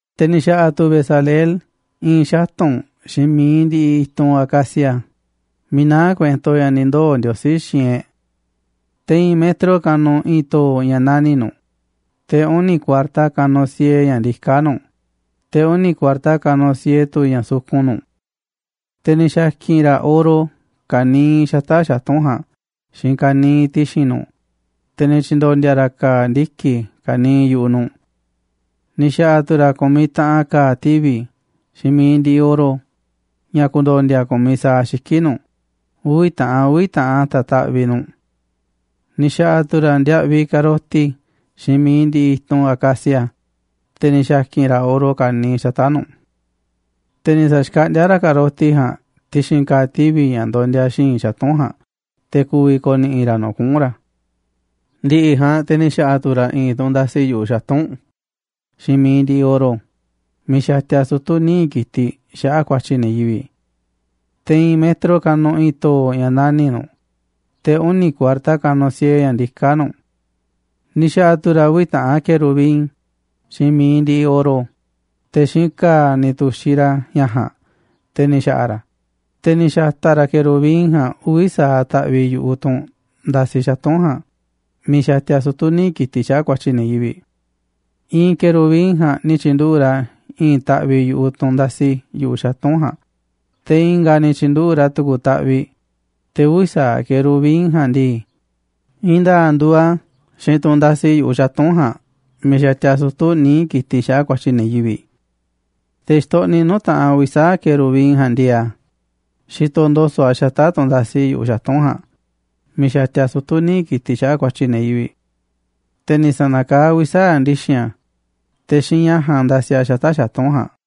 Te̱ ni̱ xa̱ꞌa̱ tu̱ Bezaleel i̱i̱n xatu̱nꞌ xiinꞌ mi̱iꞌ ndiꞌiꞌ i̱tunꞌ acacia miiꞌ naá kuento ña̱ ni̱ ndoo̱ Ndiosí xiinꞌ e̱ꞌ. Te̱ i̱i̱n metro kanuꞌ i̱i̱n to̱o̱ ña̱ nani̱ꞌ nu̱ꞌ, te̱ uni̱ kuarta kanuꞌ siee ña̱ ndiká nu̱ꞌ, te̱ uni̱ kuarta kanuꞌ siee tu̱ ña̱ sukun nu̱ꞌ. Te̱ ni̱ xa̱ki̱n ra̱ oro ka̱niiꞌ xata̱ꞌ xatu̱nꞌ ja̱a̱nꞌ xiinꞌ ka̱niiꞌ ti̱xi̱n nu̱ꞌ, te̱ ni̱ tyi̱ndo̱ndi̱a̱ ra̱ ka̱a̱ ndiki̱ ka̱niiꞌ yu̱ꞌuꞌ nu̱ꞌ. Ni̱ xa̱ꞌa̱ tu̱ ra̱ ku̱miꞌ taꞌan ka̱a̱ tivi̱ xiinꞌ mi̱iꞌ ndiꞌiꞌ oro ña̱ ku̱ndo̱ndi̱a̱ ku̱miꞌ sa̱aꞌ xiki̱ꞌ nu̱ꞌ, uvi̱ taꞌan uvi̱ taꞌan a̱ ta̱taꞌviꞌ nu̱ꞌ. Ni̱ xa̱ꞌa̱ tu̱ ra̱ ndiaꞌviꞌ ka̱roti xiinꞌ mi̱iꞌ ndiꞌiꞌ i̱tunꞌ acacia, te̱ ni̱ xa̱ki̱n ra̱ oro ka̱niiꞌ xata̱ꞌ nu̱ꞌ. Te̱ ni̱ sa̱xkaꞌndíá ra̱ ka̱roti ja̱a̱nꞌ ti̱xi̱n ka̱a̱ tivi̱ ña̱ ndondia xi̱i̱nꞌ xatu̱nꞌ ja̱a̱nꞌ te̱ ku̱vi̱ ko̱ni̱ꞌi̱ ra̱ nu̱ꞌ kuꞌu̱n ra̱. Ndi̱ꞌi̱ ja̱a̱nꞌ te̱ ni̱ xa̱ꞌa̱ tu̱ ra̱ i̱i̱n tunꞌ ndasi yu̱ꞌuꞌ xatu̱nꞌ xiinꞌ mi̱iꞌ ndiꞌiꞌ oro miiꞌ xatia sutu̱ níiꞌ ki̱tiꞌ xaꞌa̱ꞌ ku̱a̱tyi̱ ne̱ yivi̱ꞌ. Te̱ i̱i̱n metro kanuꞌ i̱i̱n to̱o̱ ña̱ nani̱ꞌ nu̱ꞌ, te̱ uni̱ kuarta kanuꞌ siee ña̱ ndiká nu̱ꞌ. Ni̱ xa̱ꞌa̱ tu̱ ra̱ uvi̱ taꞌan querubin xiinꞌ mi̱iꞌ ndiꞌiꞌ oro, te̱ xiinꞌ ka̱a̱ ni̱ tu̱xiꞌ ra̱ ña̱ ja̱a̱nꞌ te̱ ni̱ xa̱ꞌa̱ ra̱ a̱, te̱ ni̱ xa̱ta̱ ra̱ querubin ja̱a̱nꞌ uvi̱ sa̱aꞌ taꞌviꞌ yu̱ꞌuꞌ tunꞌ ndasi xatu̱nꞌ ja̱a̱nꞌ miiꞌ xatia sutu̱ níiꞌ ki̱tiꞌ xaꞌa̱ꞌ ku̱a̱tyi̱ ne̱ yivi̱ꞌ. I̱i̱n querubin ja̱a̱nꞌ ni̱ tyi̱nduꞌu̱ꞌ ra̱ i̱i̱n taꞌviꞌ yu̱ꞌuꞌ tunꞌ ndasi yu̱ꞌuꞌ xatu̱nꞌ ja̱a̱nꞌ, te̱ i̱nga̱ a̱ ni̱ tyi̱nduꞌu̱ꞌ ra̱ tu̱ku̱ taꞌviꞌ, te̱ uvi̱ sa̱aꞌ querubin ja̱a̱nꞌ ndii, i̱i̱n nda̱a̱ꞌ nduuꞌ a̱ xiinꞌ tunꞌ ndasi yu̱ꞌuꞌ xatu̱nꞌ ja̱a̱nꞌ miiꞌ xatia sutu̱ níiꞌ ki̱tiꞌ xaꞌa̱ꞌ ku̱a̱tyi̱ ne̱ yivi̱ꞌ. Te̱ xitoꞌniꞌ nuu̱ꞌ taꞌanꞌ uvi̱ sa̱aꞌ querubin ja̱a̱nꞌ ndieeꞌ a̱, xitoꞌ ndo̱so̱ꞌ a̱ xata̱ꞌ tunꞌ ndasi xatu̱nꞌ ja̱a̱nꞌ miiꞌ xatia sutu̱ níiꞌ ki̱tiꞌ xaꞌa̱ꞌ ku̱a̱tyi̱ ne̱ yivi̱ꞌ. Te̱ ni̱ sa̱na̱kaá a̱ uvi̱ sa̱aꞌ ndi̱xi̱n a̱, te̱ xiinꞌ ña̱ ja̱a̱nꞌ ndasi a̱ xata̱ꞌ xatu̱nꞌ ja̱a̱nꞌ.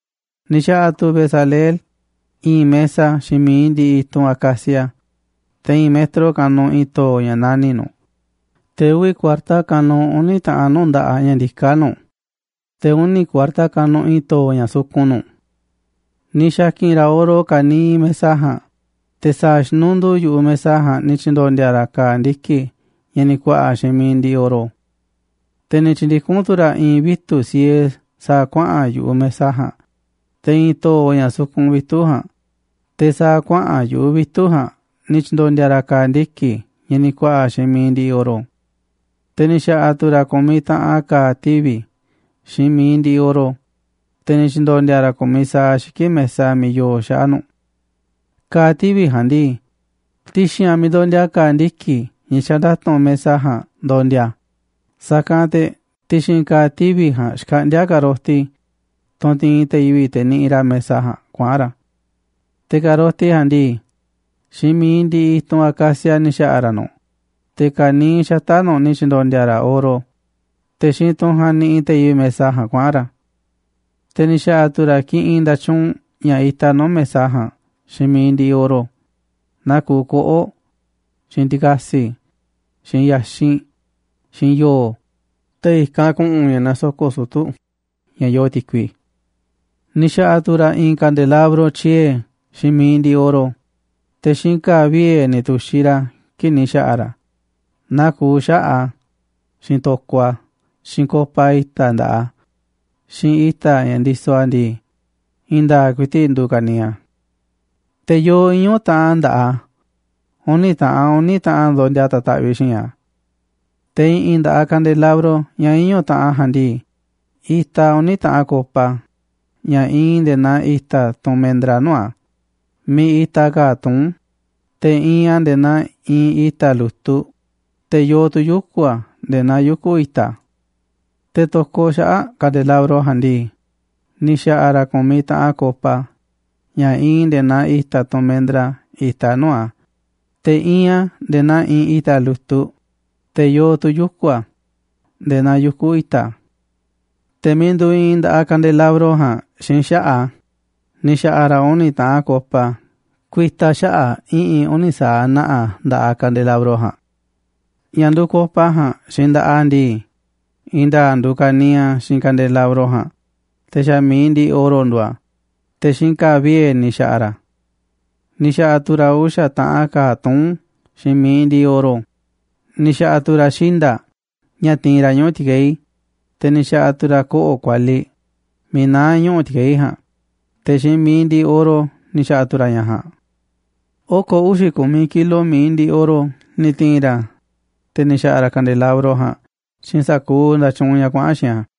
Ni̱ xa̱ꞌa̱ tu̱ Bezaleel i̱i̱n mesa xiinꞌ mi̱iꞌ ndiꞌiꞌ i̱tunꞌ acacia, te̱ i̱i̱n metro kanuꞌ i̱i̱n to̱o̱ ña̱ nani̱ꞌ nu̱ꞌ, te̱ uvi̱ kuarta kanuꞌ uni̱ taꞌanꞌ nuu̱ꞌ nda̱ꞌaꞌ ña̱ ndiká nu̱ꞌ, te̱ uni kuarta kanuꞌ i̱i̱n to̱o̱ ña̱ sukun nu̱ꞌ. Ni̱ xa̱ki̱n ra̱ oro ka̱niiꞌ mesa ja̱a̱nꞌ, te̱ sa̱a̱ xinunduu yu̱ꞌuꞌ mesa ja̱a̱nꞌ ni̱ tyi̱ndo̱ndi̱a̱ ra̱ ka̱a̱ ndiki̱ ña̱ ni̱ ku̱a̱ꞌa̱ xiinꞌ mi̱iꞌ ndiꞌiꞌ oro. Te̱ ni̱ tyi̱ndikún tu̱ ra̱ i̱i̱n vitu̱ꞌ siee sa̱a̱ kuaꞌa̱n yu̱ꞌuꞌ mesa ja̱a̱nꞌ, te̱ i̱i̱n to̱o̱ ña̱ sukun vitu̱ꞌ ja̱a̱nꞌ, te̱ sa̱a̱ kuaꞌa̱n yu̱ꞌuꞌ vitu̱ꞌ ja̱a̱nꞌ ni̱ tyi̱ndo̱ndi̱a̱ ra̱ ka̱a̱ ndiki̱ ña̱ ni̱ ku̱a̱ꞌa̱ xiinꞌ mi̱iꞌ ndiꞌiꞌ oro. Te̱ ni̱ xa̱ꞌa̱ tu̱ ra̱ ku̱miꞌ taꞌan ka̱a̱ tivi̱ xiinꞌ mi̱iꞌ ndiꞌiꞌ oro, te̱ ni̱ tyi̱ndo̱ndi̱a̱ ra̱ ku̱miꞌ sa̱aꞌ xiki̱ꞌ mesa miiꞌ yoo xaꞌa̱ꞌ nu̱ꞌ. Ka̱a̱ tivi̱ ja̱a̱nꞌ ndii, ti̱xi̱n a̱ miiꞌ ndondia ka̱a̱ ndiki̱ ña̱ xanda̱tu̱nꞌ mesa ja̱a̱nꞌ ndondia a̱, sa̱kanꞌ te̱ ti̱xi̱n ka̱a̱ tivi̱ ja̱a̱nꞌ xkaꞌndíá ka̱roti, tunꞌ ti̱i̱n te̱ yivi̱ꞌ te̱ niꞌiꞌ ra̱ mesa ja̱a̱nꞌ kuaꞌa̱n ra̱. Te̱ ka̱roti ja̱a̱nꞌ ndii, xiinꞌ mi̱iꞌ ndiꞌiꞌ i̱tunꞌ acacia ni̱ xa̱ꞌa̱ ra̱ nu̱ꞌ, te̱ ka̱niiꞌ xata̱ꞌ nu̱ꞌ ni̱ tyi̱ndo̱ndi̱a̱ ra̱ oro, te̱ xiinꞌ tunꞌ ja̱a̱nꞌ niꞌiꞌ te̱ yivi̱ꞌ mesa ja̱a̱nꞌ kuaꞌa̱n ra̱. Te̱ ni̱ xa̱ꞌa̱ tu̱ ra̱ kiꞌinꞌ nda̱tyuunꞌ ña̱ itaꞌ nuu̱ꞌ mesa ja̱a̱nꞌ xiinꞌ mi̱iꞌ ndiꞌiꞌ oro, naa kuuꞌ koꞌo̱ꞌ, xiinꞌ ti̱ka̱si̱, xiinꞌ ya̱xinꞌ, xiinꞌ yo̱o̱, te̱ i̱kanꞌ ku̱ꞌu̱n ña̱ nasoko̱ꞌ sutu̱ ña̱ yoo ti̱kui. Ni̱ xa̱ꞌa̱ tu̱ ra̱ i̱i̱n kandelabro tyiee̱ xiinꞌ mi̱iꞌ ndiꞌiꞌ oro, te̱ xiinꞌ ka̱a̱ vie̱ ni̱ tu̱xiꞌ ra̱ a̱ kii̱ꞌ ni̱ xa̱ꞌa̱ ra̱ a̱, naa kuuꞌ xaꞌa̱ꞌ a̱, xiinꞌ to̱koꞌ a̱, xiinꞌ copa ña̱ itaꞌ nda̱ꞌaꞌ a̱, xiinꞌ i̱ta̱ ña̱ ndisoꞌ a̱ ndii, i̱i̱n nda̱a̱ꞌ ku̱i̱ti̱ꞌ nduuꞌ ka̱niiꞌ a̱. Te̱ yoo iñu̱ taꞌan nda̱ꞌaꞌ a̱, uni̱ taꞌan uni̱ taꞌan a̱ ndondia ta̱taꞌviꞌ xi̱i̱nꞌ a̱. Te̱ i̱ꞌi̱n nda̱ꞌaꞌ kandelabro ña̱ iñu̱ taꞌan ja̱a̱nꞌ ndii, itaꞌ uni̱ taꞌan copa ña̱ iinꞌ nde̱e̱ naa i̱ta̱ tunꞌ mendra nuu̱ꞌ a̱, miiꞌ itaꞌ ka̱a̱ tuún, te̱ iinꞌ a̱ nde̱e̱ naa iinꞌ i̱ta̱ lu̱tuꞌ, te̱ yoo tu̱ yuku̱ a̱ nde̱e̱ naa yuku̱ i̱ta̱. Te̱ to̱koꞌ xaꞌa̱ꞌ kandelabro ja̱a̱nꞌ ndii, ni̱ xa̱ꞌa̱ ra̱ ku̱miꞌ taꞌan copa ña̱ iinꞌ nde̱e̱ naa i̱ta̱ tunꞌ mendra itaꞌ nuu̱ꞌ a̱, te̱ iinꞌ a̱ nde̱e̱ naa iinꞌ i̱ta̱ lu̱tuꞌ, te̱ yoo tu̱ yuku̱ a̱ nde̱e̱ naa yuku̱ i̱ta̱. Te̱ miiꞌ nduuꞌ iinꞌ nda̱ꞌaꞌ kandelabro ja̱a̱nꞌ xiinꞌ xaꞌa̱ꞌ a̱ ni̱ xa̱ꞌa̱ ra̱ uni̱ taꞌan copa ku̱i̱ta̱ xaꞌa̱ꞌ i̱ꞌi̱n uni̱ sa̱aꞌ na̱ꞌa̱ nda̱ꞌaꞌ kandelabro ja̱a̱nꞌ. Ña̱ nduuꞌ copa ja̱a̱nꞌ xiinꞌ nda̱ꞌaꞌ a̱ ndii, i̱i̱n nda̱a̱ꞌ nduuꞌ ka̱niiꞌ a̱ xiinꞌ kandelabro ja̱a̱nꞌ, te̱ xa̱ mi̱iꞌ ndiꞌiꞌ oro nduuꞌ a̱, te̱ xiinꞌ ka̱a̱ vie̱ ni̱ xa̱ꞌa̱ ra̱ a̱. Ni̱ xa̱ꞌa̱ ra̱ uxa̱ taꞌan ka̱a̱ tuún xiinꞌ mi̱iꞌ ndiꞌiꞌ oro, ni̱ xa̱ꞌa̱ tu̱ ra̱ xinda̱ꞌ ña̱ tiinꞌ ra̱ ñuꞌu̱ ti̱keí, te̱ ni̱ xa̱ꞌa̱ tu̱ ra̱ koꞌo̱ꞌ kualiꞌ miiꞌ naá ñuꞌu̱ ti̱keí ja̱a̱nꞌ, te̱ xiinꞌ mi̱iꞌ ndiꞌiꞌ oro ni̱ xa̱ꞌa̱ tu̱ ra̱ ña̱ ja̱a̱nꞌ. Oko̱ uxi̱ ku̱miꞌ kilo mi̱iꞌ ndiꞌiꞌ oro ni̱ ti̱i̱n ra̱, te̱ ni̱ xa̱ꞌa̱ ra̱ kandelabro ja̱a̱nꞌ xiinꞌ sa̱kuuꞌ nda̱tyuunꞌ ña̱ kuaꞌa̱n xiinꞌ a̱.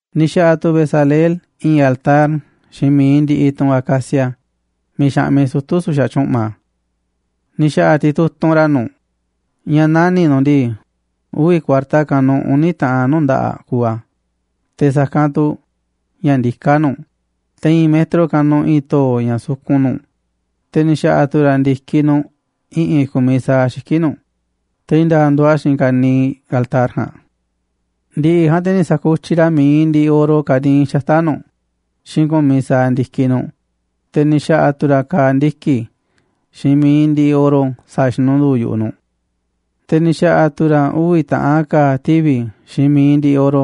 Ni̱ xa̱ꞌa̱ tu̱ Bezaleel i̱i̱n altar xiinꞌ mi̱iꞌ ndiꞌiꞌ tunꞌ acacia miiꞌ xaꞌmiꞌ sutu̱ su̱xa̱ tyu̱ꞌma. Ni̱ xa̱ꞌa̱ titutunꞌ ra̱ nu̱ꞌ ña̱ nani̱ꞌ nu̱ꞌ ndii, uvi̱ kuarta kanuꞌ uni̱ taꞌan nuu̱ꞌ nda̱ꞌaꞌ kuuꞌ a̱, te̱ sa̱kanꞌ tu̱ ña̱ ndiká nu̱ꞌ, te̱ i̱i̱n metro kanuꞌ i̱i̱n to̱o̱ ña̱ sukun nu̱ꞌ, te̱ ni̱ xa̱ꞌa̱ tu̱ ra̱ ndi̱kiꞌ nu̱ꞌ i̱ꞌi̱n ku̱miꞌ sa̱aꞌ xiki̱ꞌ nu̱ꞌ, te̱ i̱i̱n nda̱a̱ꞌ nduuꞌ a̱ xiinꞌ ka̱niiꞌ altar ja̱a̱nꞌ. Ndi̱ꞌi̱ ja̱a̱nꞌ te̱ ni̱ sa̱kutyiꞌ ra̱ mi̱iꞌ ndiꞌiꞌ oro ka̱niiꞌ xata̱ꞌ nu̱ꞌ xiinꞌ ku̱miꞌ sa̱aꞌ ndi̱kiꞌ nu̱ꞌ, te̱ ni̱ xa̱ꞌa̱ tu̱ ra̱ ka̱a̱ ndiki̱ xiinꞌ mi̱iꞌ ndiꞌiꞌ oro sa̱a̱ xinunduu yu̱ꞌuꞌ nu̱ꞌ. Te̱ ni̱ xa̱ꞌa̱ tu̱ ra̱ uvi̱ taꞌan ka̱a̱ tivi̱ xiinꞌ mi̱iꞌ ndiꞌiꞌ oro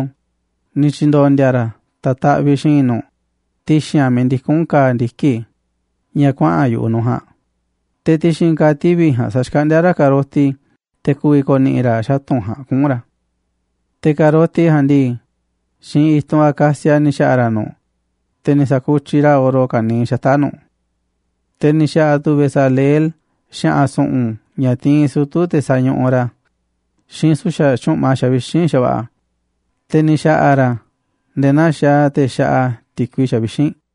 ni̱ tyi̱ndo̱ndi̱a̱ ra̱ ta̱taꞌviꞌ xiinꞌ nu̱ꞌ ti̱xi̱n a̱ miiꞌ ndikún ka̱a̱ ndiki̱ ña̱ kuaꞌa̱n yu̱ꞌuꞌ nu̱ꞌ ja̱a̱nꞌ, te̱ ti̱xi̱n ka̱a̱ tivi̱ ja̱a̱nꞌ sa̱xkaꞌndíá ra̱ ka̱roti te̱ ku̱vi̱ ko̱ni̱ꞌi̱ ra̱ xatu̱nꞌ ja̱a̱nꞌ kuꞌu̱n ra̱. Te̱ ka̱roti ja̱a̱nꞌ ndii, xiinꞌ i̱tunꞌ acacia ni̱ xa̱ꞌa̱ ra̱ nu̱ꞌ, te̱ ni̱ sa̱kutyiꞌ ra̱ oro ka̱niiꞌ xata̱ꞌ nu̱ꞌ. Te̱ ni̱ xa̱ꞌa̱ tu̱ Bezaleel xa̱ꞌa̱n su̱ꞌu̱n ña̱ tiinꞌ sutu̱ te̱ sañuꞌuꞌ ra̱, xiinꞌ su̱xa̱ tyu̱ꞌma xavixínꞌ xa̱va̱ꞌa̱, te̱ ni̱ xa̱ꞌa̱ ra̱ a̱ nde̱e̱ naa xaaꞌ te̱ xaꞌa ti̱kui xavixínꞌ.